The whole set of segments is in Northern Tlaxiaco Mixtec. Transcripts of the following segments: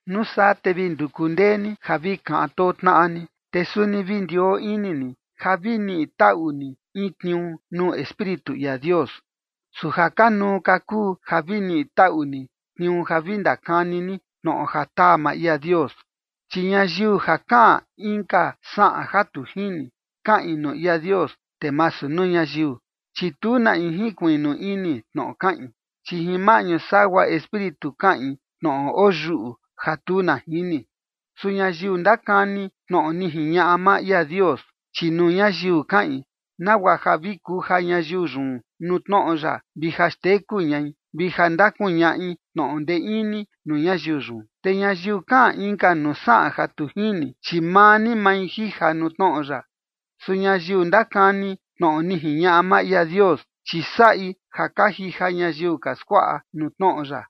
Nuu saa te vi nduku ndee ni ja vi kaꞌan too tnaꞌa ni, te suni vi ndioo ini ni ja vi niꞌi taꞌu ni in tniuu nuu Espíritu ia Dios, su ja kanuu ka kuu ja vi niꞌi taꞌu ni tniuu ja vi ndakani ni tnoꞌo ja taa maa ia Dios. Chi ñayiu ja kaꞌan inka saꞌan ja tu jini, kaꞌin nuu ia Dios, te masu nuu ñayiu, chi tu na in jinkuiꞌnu ini tnoꞌo kaꞌin, chi jin maꞌñu sagua Espíritu kaꞌin tnoꞌo oyuꞌu ja tu na jini. Su ñayiu ndakani tnoꞌo ni jiñaꞌa maa ia Dios, chi nuu ñayiu kaꞌin, nagua ja vi kuja ñayiu yun nuu tnoꞌo ya, vi ja xteku ñai, vi ja ndakuñaꞌi tnoꞌo ndee ini nuu ñayiu yun. Te ñayiu kaꞌan inka nuu saꞌan ja tu jini, chi maa ni mai jija nuu tnoꞌo ya. Su ñayiu ndakani tnoꞌo ni jiñaꞌa maa ia Dios, chi saꞌi ja ka jija ñayiu ka skuaꞌa nuu tnoꞌo ya.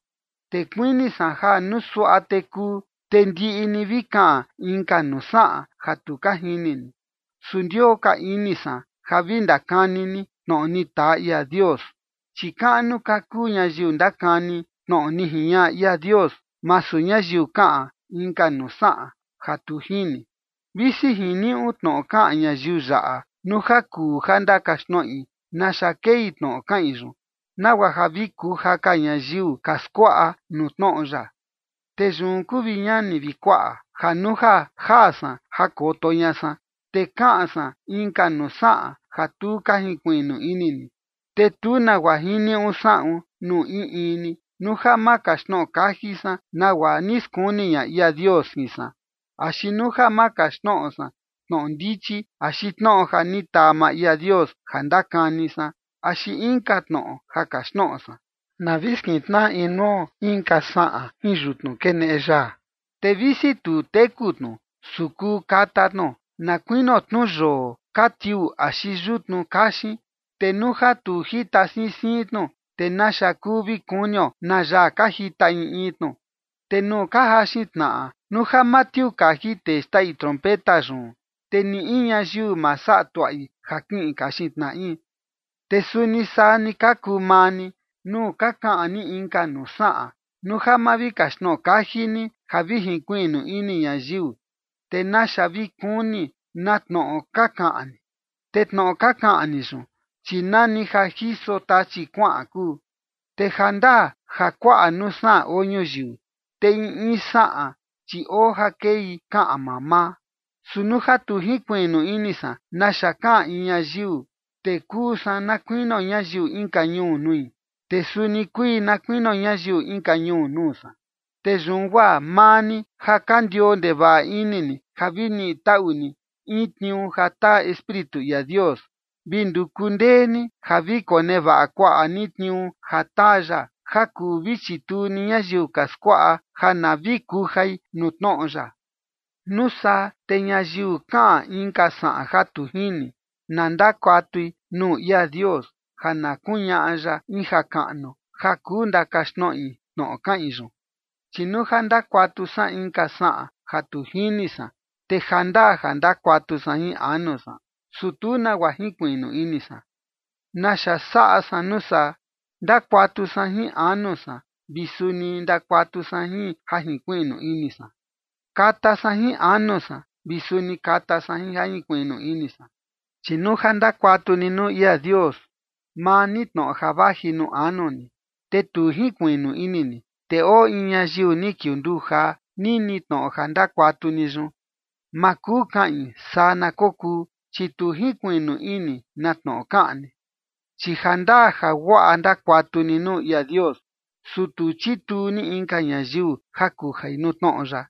Te kuini san ja nuu suaꞌa te kuu, te ndiꞌi ni vi kaꞌan inka nuu saꞌan ja tu ka jini ni, su ndioo ka ini san ja vi ndakani ni tnoꞌo ni taa ia Dios, chi kaꞌnu ka kuu ñayiu ndakani tnoꞌo ni jiñaꞌa ia Dios, masu ñayiu kaꞌan inka nuu saꞌan ja tu jini, visi jiniuꞌu tnoꞌo kaꞌan ñayiu yaꞌa nuu ja kuu ja ndakaxtnoꞌi naxa kei tnoꞌo kaꞌin yun, nagua ja vi kuja ka ñayiu ka skuaꞌa nuu tnoꞌo ya. Te yun kuu, vi ñani vi kuaꞌa, ja nuu ja jaa san ja jakoto ña san, te kaꞌan san inka nuu saꞌan ja tu ka jinkuiꞌnu ini ni, te tu nagua jiniuꞌu saꞌun nuu in in ni, nuu ja ma kaxtnoꞌo kaji san nagua ni skuni ña ia Dios jin san, axi nuu ja ma kaxtnoꞌo san tnoꞌo ndichi axi tnoꞌo ja ni taa maa ia Dios ja ndakani san, axi inka tnoꞌo ja kaxtnoꞌo san. Na vi skintnaꞌa inuo inka saꞌan jin yutnu keneꞌe yaa. Te visi tu teku tnu, su kuu kata tnu, na kuinio tnu yoo ka tiuu axi yutnu kaxin, te nuu ja tu jita siin siin tnu, ¿te naxa kuu vi kunio na yaa ka jita in in tnu? Te nuu ka jaxin tnaꞌa, nuu ja ma tiuu kaji tee xtaꞌi trompeta yun, te ni in ñayiu ma saꞌa tuaꞌi ja kiꞌin kaxin tnaꞌi. Te suni saa ni ka kuu maa ni, nuu ka kaꞌan ni inka nuu saꞌan, nuu ja ma vi kaxtnoꞌo kaji ni ja vi jinkuiꞌnu ini ñayiu, ¿te naxa vi kuni na tnoꞌo ka kaꞌan ni? Te tnoꞌo ka kaꞌan ni yun, chi nani ja jiso tachi kuaꞌan kuu. Te jandaa ja kuaꞌa nuu saꞌan oo ñuyiu, te in in saꞌan, chi oo ja kei kaꞌan mamaa. Su nuu ja tu jinkuiꞌnu ini san naxa kaꞌan in ñayiu, te kuu san na kuinio ñayiu inka ñuu nui, te suni kui na kuinio ñayiu inka ñuu nuu san. Te yun guaa maa ni, ja ka ndioo ndevaꞌa ini ni ja vi niꞌi taꞌu ni in tniuu ja taa Espíritu ia Dios, vi nduku ndee ni ja vi konevaꞌa kuaꞌa ni tniuu ja taa ya, ja kuu vi chituu ni ñayiu ka skuaꞌa ja na vi kujai nuu tnoꞌo ya. Nuu saa te ñayiu kaꞌan inka saꞌan ja tu jini, na ndakuatui nuu ia Dios ja na kuñaꞌa ya in jakaꞌnu ja kuu ndakaxtnoꞌi tnoꞌo kaꞌin yun. Chi nuu ja ndakuatu san inka saꞌan ja tu jini san, te jandaa ja ndakuatu san jin anu san, su tu nagua jinkuiꞌnu ini san. ¿Naxa saꞌa san nuu saa? Ndakuatu san jin anu san vi suni ndakuatu san jin ja jinkuiꞌnu ini san. Kata san jin anu san vi suni kata san jin ja jinkuiꞌnu ini san. Chi nuu ja ndakuatu ni nuu ia Dios maa ni tnoꞌo ja vaji nuu anu ni, te tu jinkuiꞌnu ini ni, te oo in ñayiu ni kiunduu jaa nini tnoꞌo ja ndakuantaꞌu ni yun, ma kuu kaꞌin “saa na kokuu”, chi tu jinkuiꞌnu ini na tnoꞌo kaꞌan ni. Chi jandaa ja guaꞌa ndakuantaꞌu ni nuu ia Dios, su tu chituu ni inka ñayiu ja kujai nuu tnoꞌo ya.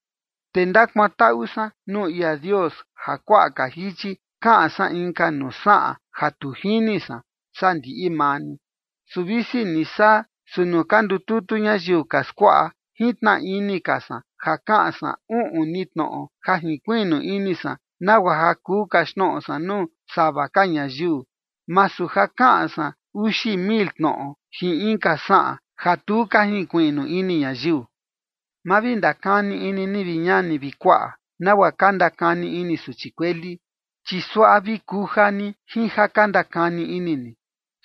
Te ndakuantaꞌu san nuu ia Dios ja kuaꞌa ka jichi kaꞌan san inka nuu saꞌan ja tu jini san, saa ndiꞌi maa ni. Su visi ni saa, su nuu ka ndututu ñayiu ka skuaꞌa, jintnaꞌa ini ka san ja kaꞌan san uꞌun ni tnoꞌo ja jinkuiꞌnu ini san, nagua ja kuu kaxtnoꞌo san nuu sava ka ñayiu, masu ja kaꞌan san uxi mil tnoꞌo jin inka saꞌan ja tu ka jinkuiꞌnu ini ñayiu. Ma vi ndakani ini ni, vi ñani vi kuaꞌa, nagua ka ndakani ini suchi kueli, chi suaꞌa vi kuja ni jin ja ka ndakani ini ni.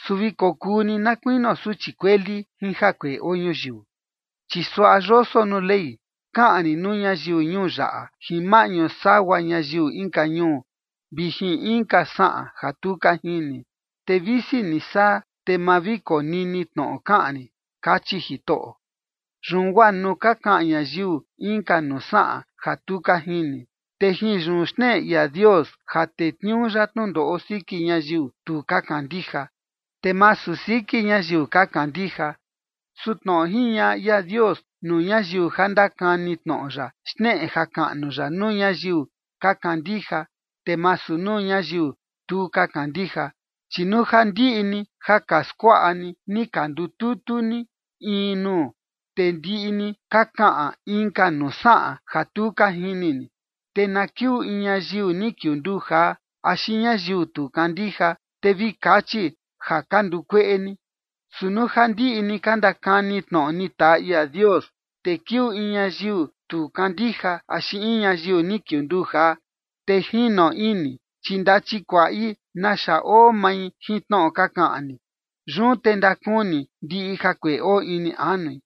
Su vi kokuu ni na kuinio suchi kueli jin jakueꞌe ja oo ñuyiu. Chi suaꞌa yoso nuu Ley: “Kaꞌan rin nuu ñayiu ñuu yaꞌa jin maꞌñu sagua ñayiu inka ñuu vi jin inka saꞌan ja tu ka jini, te visi ni saa, te ma vi konini tnoꞌo kaꞌan rin, kachi Jitoꞌo”. Yun guaa nuu ka kaꞌan ñayiu inka nuu saꞌan ja tu ka jini, te jin yun xneꞌe ia Dios ja tetniuu ya tnundoꞌo siki ñayiu tu ka kandija, te masu siki ñayiu ka kandija. Su tnoꞌo jiñaꞌa ia Dios nuu ñayiu ja ndakani tnoꞌo ya xneꞌe jakaꞌnu ya nuu ñayiu ka kandija, te masu nuu ñayiu tu ka kandija. Chi nuu ja ndiꞌi ni ja ka skuaꞌa ni ni ka ndututu ni in ni nuu, te ndiꞌi ni ka kaꞌan inka nuu saꞌan ja tu ka jini ni, te na kiuu in ñayiu ni kiunduu jaa axi ñayiu tu kandija, te vi kachi ja ka ndukueꞌe ni. Su nuu ja ndiꞌi ni ka ndakani tnoꞌo ni taa ia Dios, te kiuu in ñayiu tu kandija axi in ñayiu ni kiunduu jaa, te jino ini, chi ndachikuaꞌi naxa oo mai jin tnoꞌo ka kaꞌan ni. Yun te ndakuni ndiꞌi jakueꞌe oo ini anui,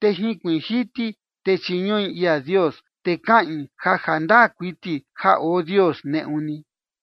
te jinkuiin jiti, te chiñuꞌi ia Dios, te kaꞌin ja jandaa kuiti ja oo Dios neꞌu ni.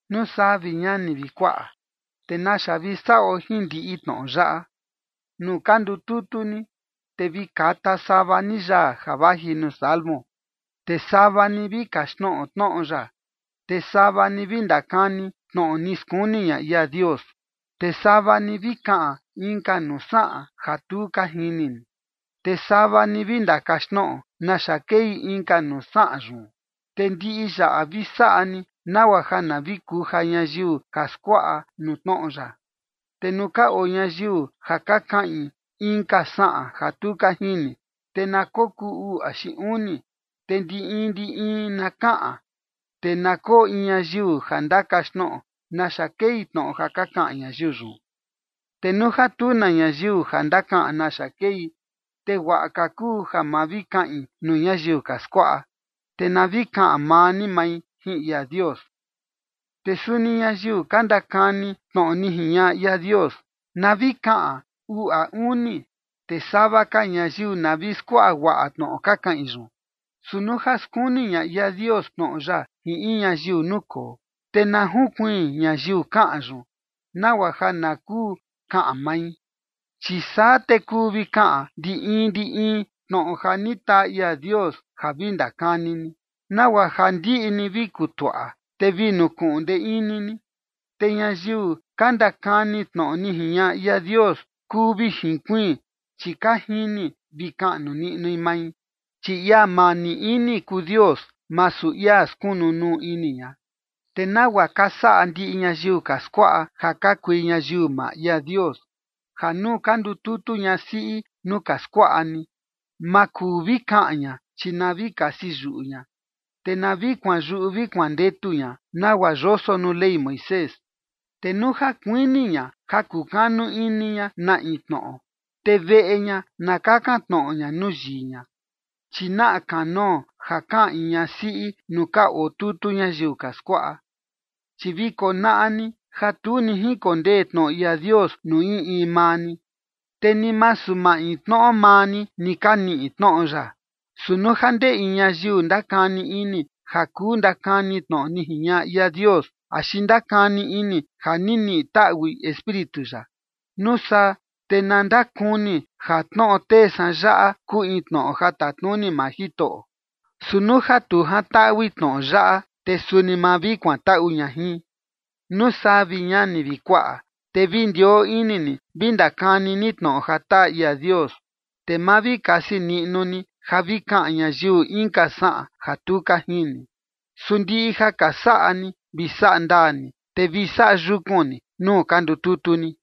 Nuu saa, vi ñani vi kuaꞌa, ¿te naxa vi saꞌo jin ndiꞌi tnoꞌo yaꞌa? Nuu ka ndututu ni, te vi kata sava ni yaa ja vaji nuu Salmo, te sava ni vi kaxtnoꞌo tnoꞌo ya, te sava ni vi ndakani tnoꞌo ni skuni ña ia Dios, te sava ni vi kaꞌan inka nuu saꞌan ja tu ka jini ni, te sava ni vi ndakaxtnoꞌo naxa kei inka nuu saꞌan yun. Te ndiꞌi yaꞌa vi saꞌa ni nagua ja na vi kuja ñayiu ka skuaꞌa nuu tnoꞌo ya. Te nuu ka oo ñayiu ja ka kaꞌin inka saꞌan ja tu ka jini, te na kokuu uu axi uni, te ndi in ndi in na kaꞌan, te na koo in ñayiu ja ndakaxtnoꞌo naxa kei tnoꞌo ja ka kaꞌan ñayiu yun. Te nuu ja tu na ñayiu ja ndakaꞌan naxa kei, te guaꞌa ka kuu ja ma vi kaꞌin nuu ñayiu ka skuaꞌa, te na vi kaꞌan maa ni mai jin ia Dios. Te suni ñayiu ka ndakani tnoꞌo ni jiñaꞌa ia Dios, na vi kaꞌan uu a uni, te sava ka ñayiu na vi skuaꞌa guaꞌa tnoꞌo ka kaꞌin yun. Su nuu ja skuni ña ia Dios tnoꞌo ya jin in ñayiu nukoo, te na junkuiin ñayiu kaꞌan yun, nagua ja na kuu kaꞌan mai. Chi saa te kuu vi kaꞌan ndi in ndi in ni tnoꞌo ja ni taa ia Dios ja vi ndakani ni, nagua ja ndiꞌi ni vi kutuaꞌa, te vi nukuꞌun ndee ini ni. Te ñayiu ka ndakani tnoꞌo ni jiñaꞌa ia Dios kuu vi junkuiin, chi ka jini vi kaꞌnu niꞌnui mai. Chi ia mani ini kuu Dios, masu ia skunu nuu ini ña. Te nagua ka saꞌa ndiꞌi ñayiu ka skuaꞌa, ja ka kui ñayiu maa ia Dios, ja nuu ka ndututu ñasiꞌi nuu ka skuaꞌa ni, ma kuu vi kaꞌan ña, chi na vi kasi yuꞌu ña, te na vi kuanyuꞌu vi kuandetu ña nagua yoso nuu Ley Moisés. Te nuu ja kuini ña ja kukanu ini ña na in tnoꞌo, te veꞌe ña na kakan tnoꞌo ña nuu yii ña, chi naꞌa kanoo ja kaꞌan in ñasiꞌi nuu ka oo tutu ñayiu ka skuaꞌa. Chi vi konaꞌa ni ja tu ni jinkondee tnoꞌo ia Dios nuu in in maa ni, te ni masu maintnoꞌo maa ni ni ka niꞌi tnoꞌo ya. Su nuu ja ndee in ñayiu ndakani ini ja kuu ndakani tnoꞌo ni jiñaꞌa ia Dios axi ndakani ini ja ni niꞌi taꞌui Espíritu ya, nuu saa te na ndakuni ja tnoꞌo tee san yaꞌa kuu in tnoꞌo ja tatnuni maa Jitoꞌo. Su nuu ja tu jantaꞌui tnoꞌo yaꞌa, te suni ma vi kuantaꞌu ña jin. Nuu saa, vi ñani vi kuaꞌa, te vi ndioo ini ni vi ndakani ni tnoꞌo ja taa ia Dios, te ma vi kasi niꞌnu ni ja vi kaꞌan ñayiu inka saꞌan ja tu ka jini. Su ndiꞌi ja ka saꞌa ni vi saꞌa ndaa ni, te vi saꞌa yukun ni nuu ka ndututu ni.